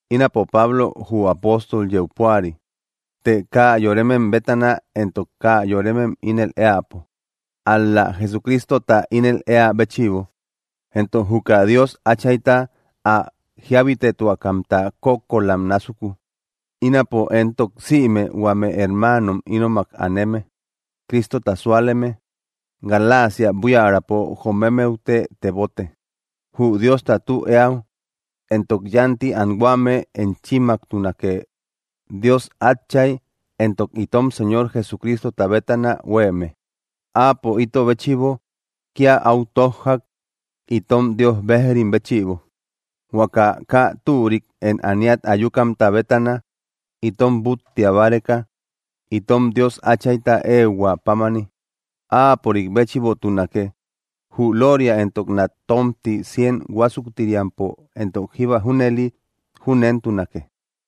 Ínapo, Pablo, jü apóstol, yeu púari të kaa yorem bétana éntok kaa yoremem júnel eäpo, ál‑la Jesucristota ínel eä béchïbo, entok juka Dios Achayta, ä jíabitetuakamta kókkolam násuku. Ínapo éntok sïme huame hermaanom ínomak aneme, Cristota súaleme Galaacia buiärapo jomemmeute tebote. Jü Diosta tü eäu éntok yánti anhuame enchimmaktunake, Dios Átchay, éntok itom Señor Jesucristota bétana huéeme. Áapo ito béchïbo kia áu tójjak itom Dios bejrim béchïbo, huaka kaa türik én ániat ayukamta bétana itom búttia báreka, itom Dios Áchayta ehuä pámani. ¡Áapörik béchïbotunake jü lóoria éntok nat tómti cien huásuktiriampo éntok jíba junëli! Júnentunake.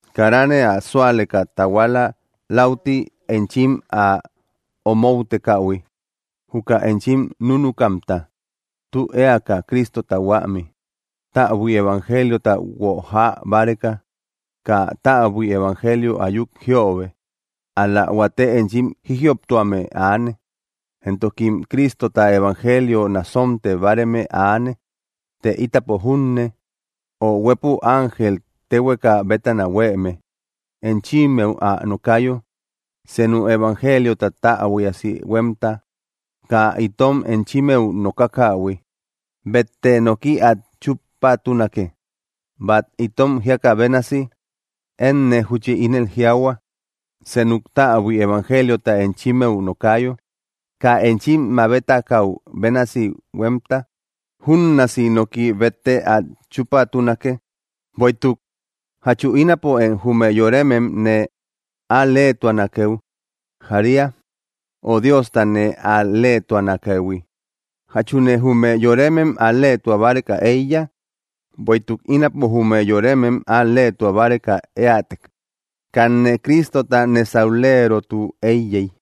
Karane ä sualeka tahuala läuti enchim ä omoutekähui juka enchim núnukamta, tü eaka Cristota huämi, täbui evangeliota guojaa báreka. Kaa täbui evangelio ayuk jiöbe. Ál‑la huate enchim jijïoptuame aane, éntokim Cristota evangelio nasonte báareme aane. Të ítapo junne, o huépü ángel téhueka bétana huéeme, enchimmeu ä nokayo senu evangeliota täbuiasi huémta kaa itom enchimmeu nokakähui, bette noki át chúpatunake. Bát itom jíakä bénasi, énne júchi ínel jiaahua: Senuk täbui evangeliota enchimmeu nokayo kaa enchim mabetakäu bénasi huémta, júnnaasi noki bette át chúpatunake. Bueïtuk, ¿jachu ínapo én jume yoremem nee al-leetuanakeu jaria ö Diosta nee al‑leetuanakëhui? ¿Jachune jume yoremem al‑leetua báreka éiya? Bueïtuk ínapo jume yoremem al‑leetua báreka éätek, kanne Cristota nésauleerotu éiyey.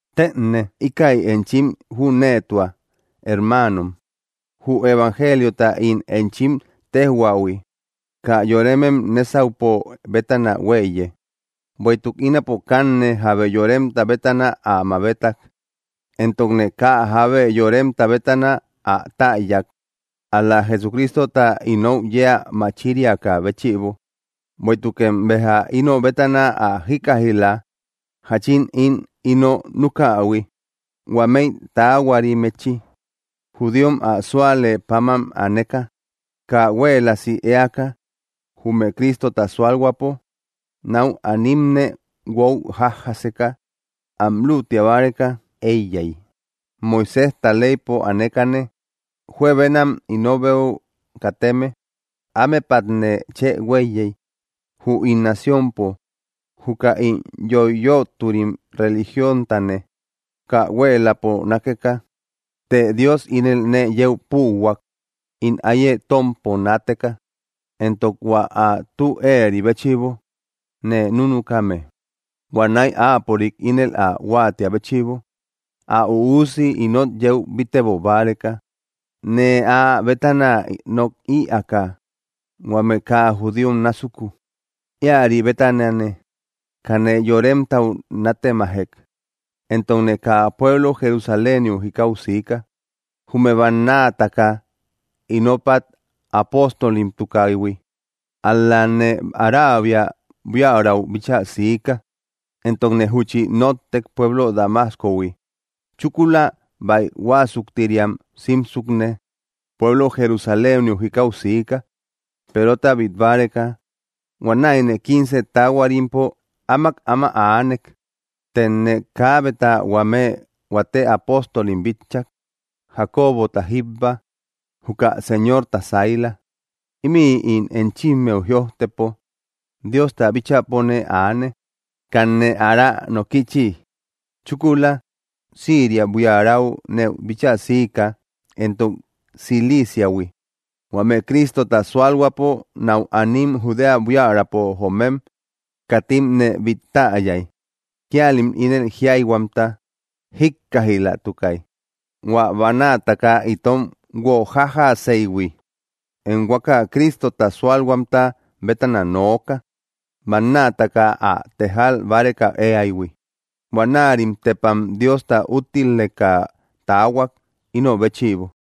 Tëne ikäi enchim jüneetua, hermaanom, jü evangeliota ín enchim téjhuähui, kaa yoremem nésaupo bétana huéiye; bueïtuk ínapo kanne jábe yoremta bétana ä mabetak, éntokne kaa jábe yoremta bétana ä täyak ál‑la Jesucristota inou yeä machiriakä béchïbo. Bueïtukem béja ino bétana ä jíkkaij‑la, jáchin ín ino nükähui huamei taahuarimmechï judíom ä sualë páman aneka. Kaa huéeläsi éaka jume Cristota sualhuäpo nau animne guojajaseka, ám lútia báreka eiyay. Moiséjta leypo anekane juebenam inobeu kateme ámepatne chë huéiyey, jü ín naciompo juka ín yoiyöturim religióntane kaa huéeläpo nákeka. Të Dios ínel nee yeu púuhuak ín áiye tómpo naateka, éntok hua ä tü éeri béchïbo nee núnukame. Huanäi, áapörik ínel ä huatia béchïbo, ä Üusi inot yeu bíttebo báreka, nee áa bétana nok ïaaka huame kaa judíom násuku. Íäri bétanane, kanne yoremtau nátemajek, éntokne kaa pueblo Jerusaléniu jikau siika, jume bannaataka ínopat apóstolimtukaïhui. Ál‑lane Araabia buiärau bíchaa siika, éntokne júchi nóttek pueblo Damascohui. Chúkula, báij huásuktiriam simsukne pueblo Jerusaléniu jikau siika, Perota bít báreka. Huanäine quince taahuarimpo áamak áma aanek. Tëne kaabeta huame huate apóstolim bitchak, Jacobota jíbba, juka Señorta saila. Ímï ín enchimmeu jïojtëpo, Diosta bíchäpone aane: Kanne ára nókïchi. Chúkula, Siiria buiärau nee bíchaa siika éntok Ciliiciahui. Huame Cristota sualhuäpo nau anim Judea buiärapo joomem, katim nee bít täyay. Kíalim ínel jíayhuamta jíkkaijlatukay: “Huä bannaataka itom guojajaseïhui, én huaka Cristota súalhuamta bétana nooka, bannaataka ä tejal báreka eaïhui.” Huanärim tepam Diosta úttileka taahuak ino béchïbo.